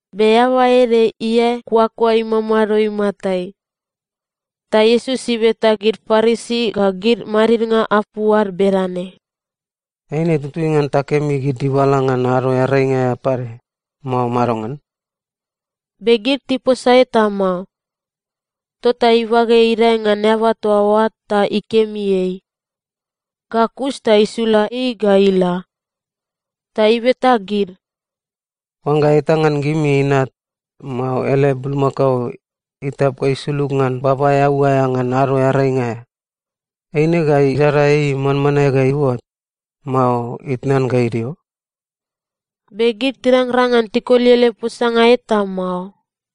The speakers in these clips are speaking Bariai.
Be eaba ede iae kuakua imamado imatai. Ta Iesus ibeta gid Parisi ga gid madidnga apu ad bedane, “Eine tutui ngan takemi gid dibala ngan Ado Earainga aea pade, mao madongan?” Be gid tiposa eta mao. Tota ibage idae ngan eaba toa oa ta ikemi ei. Ga kus ta isula ei ga ila. Ta ibeta gid, “Oangga eta ngan gimi inat, mao ele bulmakao, itap ga isulug ngan baba eau aea ngan Ado Earainga aea, eine ga idada ei manmanae ga iuot, mao itnan ga idio?” Be gid tirangrang ngan tikoli ele posanga eta mao.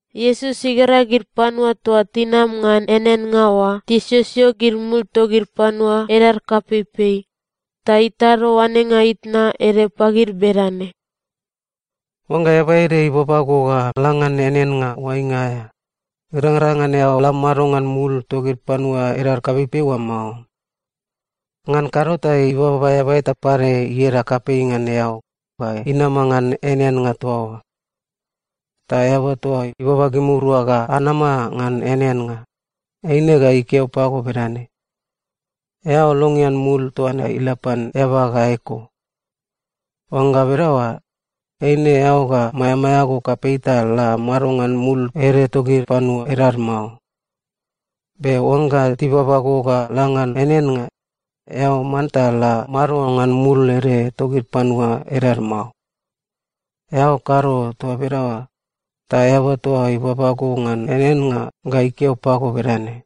Iesus igera gid panua toa tinama ngan eaneannga oa tisiosio gid mul togid panua edad kapeipei, ta itado oanenga itna ede pagid bedane, “Oangga eaba ede ibaba go ga la ngan eaneannga oainga aea, irangrang ngan eao la mado ngan mul togid panua edad kapeipei oa mao. Ngan kado ta ibaba eaba eta pade ieda kapei ngan eao ga inama ngan eaneannga toa oa. Ta eaba toa ibaba gimirua ga anama ngan eaneannga, eine ga ikeo pago bedane, ‘Eao longean mul toa ne ila pan eaba ga eko.’ Oangga bedaoa, eine eao ga maeamaea go kapei ta la mado ngan mul ede togid panua edad mao. Be oangga tibaba go ga la ngan eaneannga, eao manta la mado ngan mul ede togid panua edad mao. Eao kado toa bedaoa, ta eaba toa ibaba go ngan eaneannga ga ikeo pago bedane,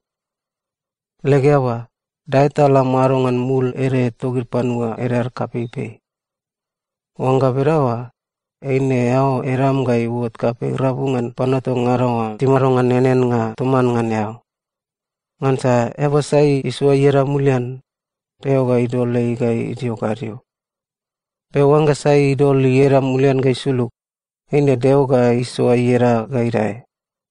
‘Leg eaba, dae ta la mado ngan mul ede togid panua edad kapeipei.’ Oangga bedaoa, eine eao edam ga iuot kapei rabu ngan panua toa ngada oa timado ngan eaneannga toman ngan eao. Ngansa eaba sai isoa ieda mulian, Deo ga idol ei ga idio gadio. Be oangga sai idol ieda mulian ga isulug, eine Deo ga isoa ieda ga idae.”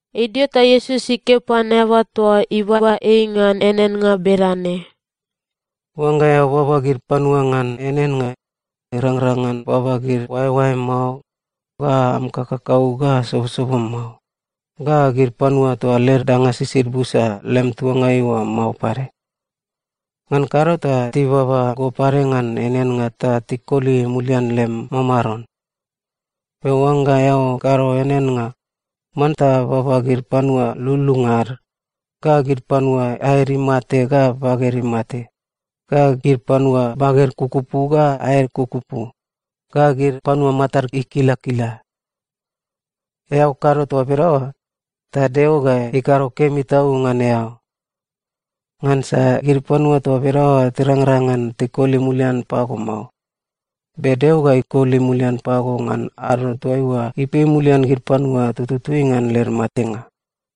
Idio ta Iesus ikeo pan eaba toa ibaba ei ngan eaneannga bedane, “Oangga eao baba gid panua ngan eaneannga, irangrang ngan baba gid oaeoaem mao, ga am kakakau ga sobosobom mao, ga gid panua toa led danga sisid busa lem tuangai oa mao pade. Ngan kado ta tibaba go pade ngan eaneannga ta tikoli mulian lem mamaron. Be oangga eao kado eaneannga, manta baba gid panua lululunga ad, ga gid panua aed imate ga baged imate, ga gid panua baged kukupu ga aed kukupu, ga gid panua matad ikilakila. Eao kado toa bedaoa, ta Deo ga ikado kemi tau ngan eao. Ngansa gid panua toa bedaoa tirangrang ngan tikoli mulian pago mao, be Deo ga ikoli mulian pago ngan ado toaiua ipei mulian gid panua tututui ngan led matenga.”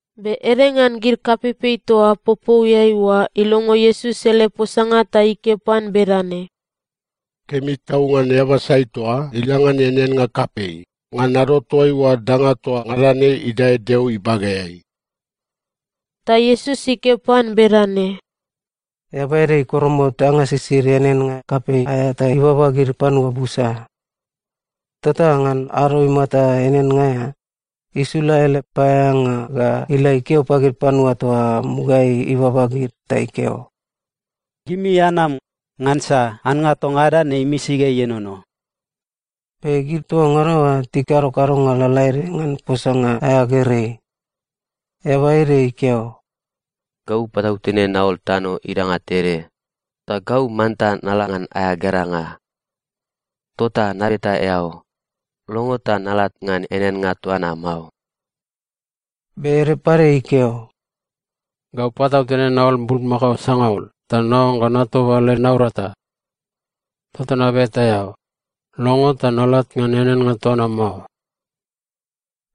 Be ede ngan gid kapeipei toa popouiai oa ilongo Iesus ele posanga ta ikeo pan bedane, “Kemi tau ngan eaba sai toa ila ngan eaneannga kapei ngan ado toaiua danga toa ngada ne idae Deo ibageai!” Ta Iesus ikeo pan bedane, “Eaba ede ikoromot danga sisid eaneannga kapei aea ta ibaba gid panua busa. Tota ngan ado imata eaneannga aea, isula ele paeaeanga ga ila ikeo pagid panua toa mugaeai ibaba gid ta ikeo, ‘Gimi anam, ngansa annga toa ngada ne imisi ga ienono.’ “Be gid toa ngada oa tikado kadonga lalaede ngan posanga aea gerei. Eaba ede ikeo, ‘Gau patautene naol tano idanga tede, ta gau manta nala ngan aea geranga. Tota nabeta eao, longo ta nalat ngan eaneannga toa na mao.’ “Be ede pade ikeo, ‘Gau patautene naol bulmakao sangaul ta naoangga natoba led naurata. Tota nabeta eao, longo ta nalat ngan eaneannga toa na mao.’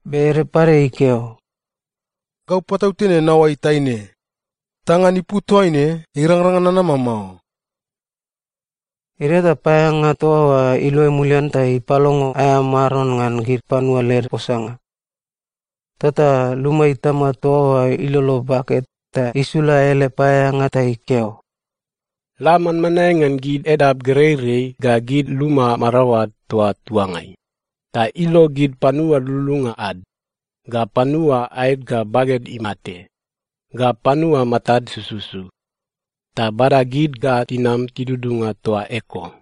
“Be ede pade ikeo, ‘Gau patautene naoai taine. Ta ngan ipu toaine irangrang ngan nanama mao.’ “Idio ta paeaeanga toa oa iluai mulian ta ipalongo aea maron ngan gid panua led posanga. Tota luma itama toa oa ilolo bake ta isula ele paeaeanga ta ikeo, ‘La manmanae ngan gid edap gereirei ga gid luma maraoad toa tuangai, ta ilo gid panua lululunga ad, ga panua aed ga baged imate, ga panua matad sususu, ta bada gid ga tinam tidudunga toa eko.’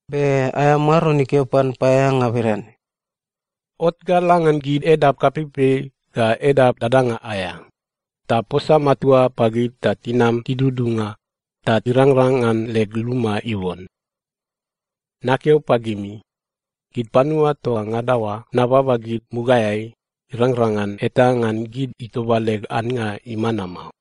“Be aea maron ikeo pan paeaeanga bedane, ‘Ot ga la ngan gid edap kapeipei ga edap dadanga aea, ta posa matua pagid ta tinam tidudunga, ta irangrang ngan leg luma iuon. Nakeo pagimi, gid panua toa ngada oa nababa gid mugaeai, irangrang ngan eta ngan gid itoba leg annga imana mao.’”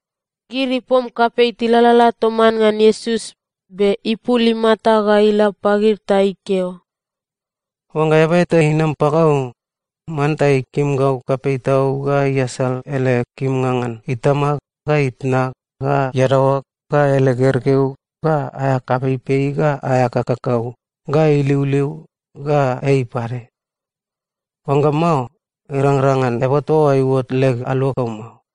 Gid ipom kapei tilalala toman ngan Iesus, be ipul imata ga ila pagid ta ikeo, “Oangga eaba eta inam pagau, manta ikim gau kapei tau ga iasal ele kimnga ngan itama, ga itna, ga iadaoa, ga ele gergeu, ga aea kapeipei, ga aea kakakau, ga iliuliu, ga ei pade. Oangga mao, irangrang ngan eaba toa oa iuot leg aluagau mao.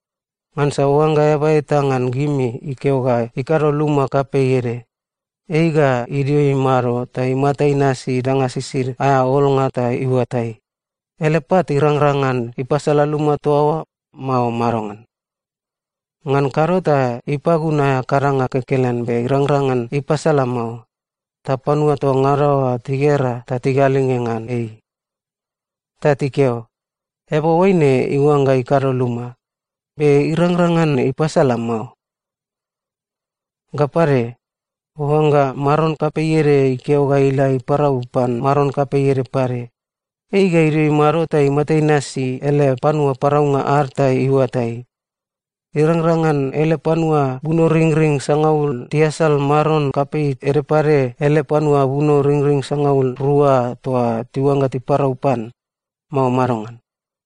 “Ngansa oangga eaba eta ngan gimi ikeo ga ikado luma kapei ede, ei ga idio imado ta imata inasi danga sisid aea olnga ta iuatai, ele pat irangrang ngan ipasala luma toa oa, mao madongan. Ngan kado ta ipagun aea kadanga kekelen be irangrang ngan ipasala mao, ta panua toa ngada oa tigera ta tigalinge ngan ei. Ta tikeo, ‘Eaba oaine iuangga ikado luma, be irangrang ngan ipasala mao.’ “Ga pade, oangga maron kapei ede ikeo ga ila iparau pan maron kapei ede pade, ei ga idio imado ta imata inasi ele panua paraunga ad ta iuatai, irangrang ngan ele panua bunoringring sangaul tiasal maron kapei ede pade ele panua bunoringring sangaul rua toa tiuangga tiparau pan, mao madongan.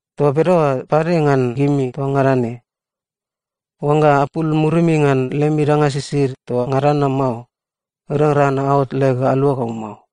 Toa bedaoa pade ngan gimi toa ngada ne. Oangga apul murimi ngan lemi danga sisid toa ngada na mao, irangrang ngan aot leg aluagau mao.”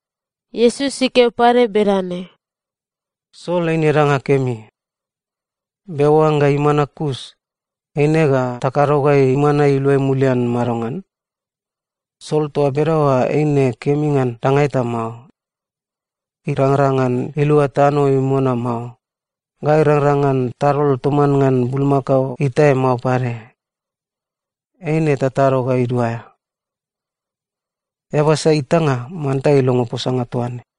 Iesus ikeo pade bedane, “Sol eine danga kemi. Be oangga imana kus, eine ga takado ga imana iluai mulian madongan? Sol toa bedaoa eine kemi ngan danga eta mao. Irangrang ngan ilua tano imona mao, ga irangrang ngan tadol toman ngan bulmakao itae mao pade. Eine tatado ga iduaea. “Eaba sai itanga, manta ilongo posanga toaine.”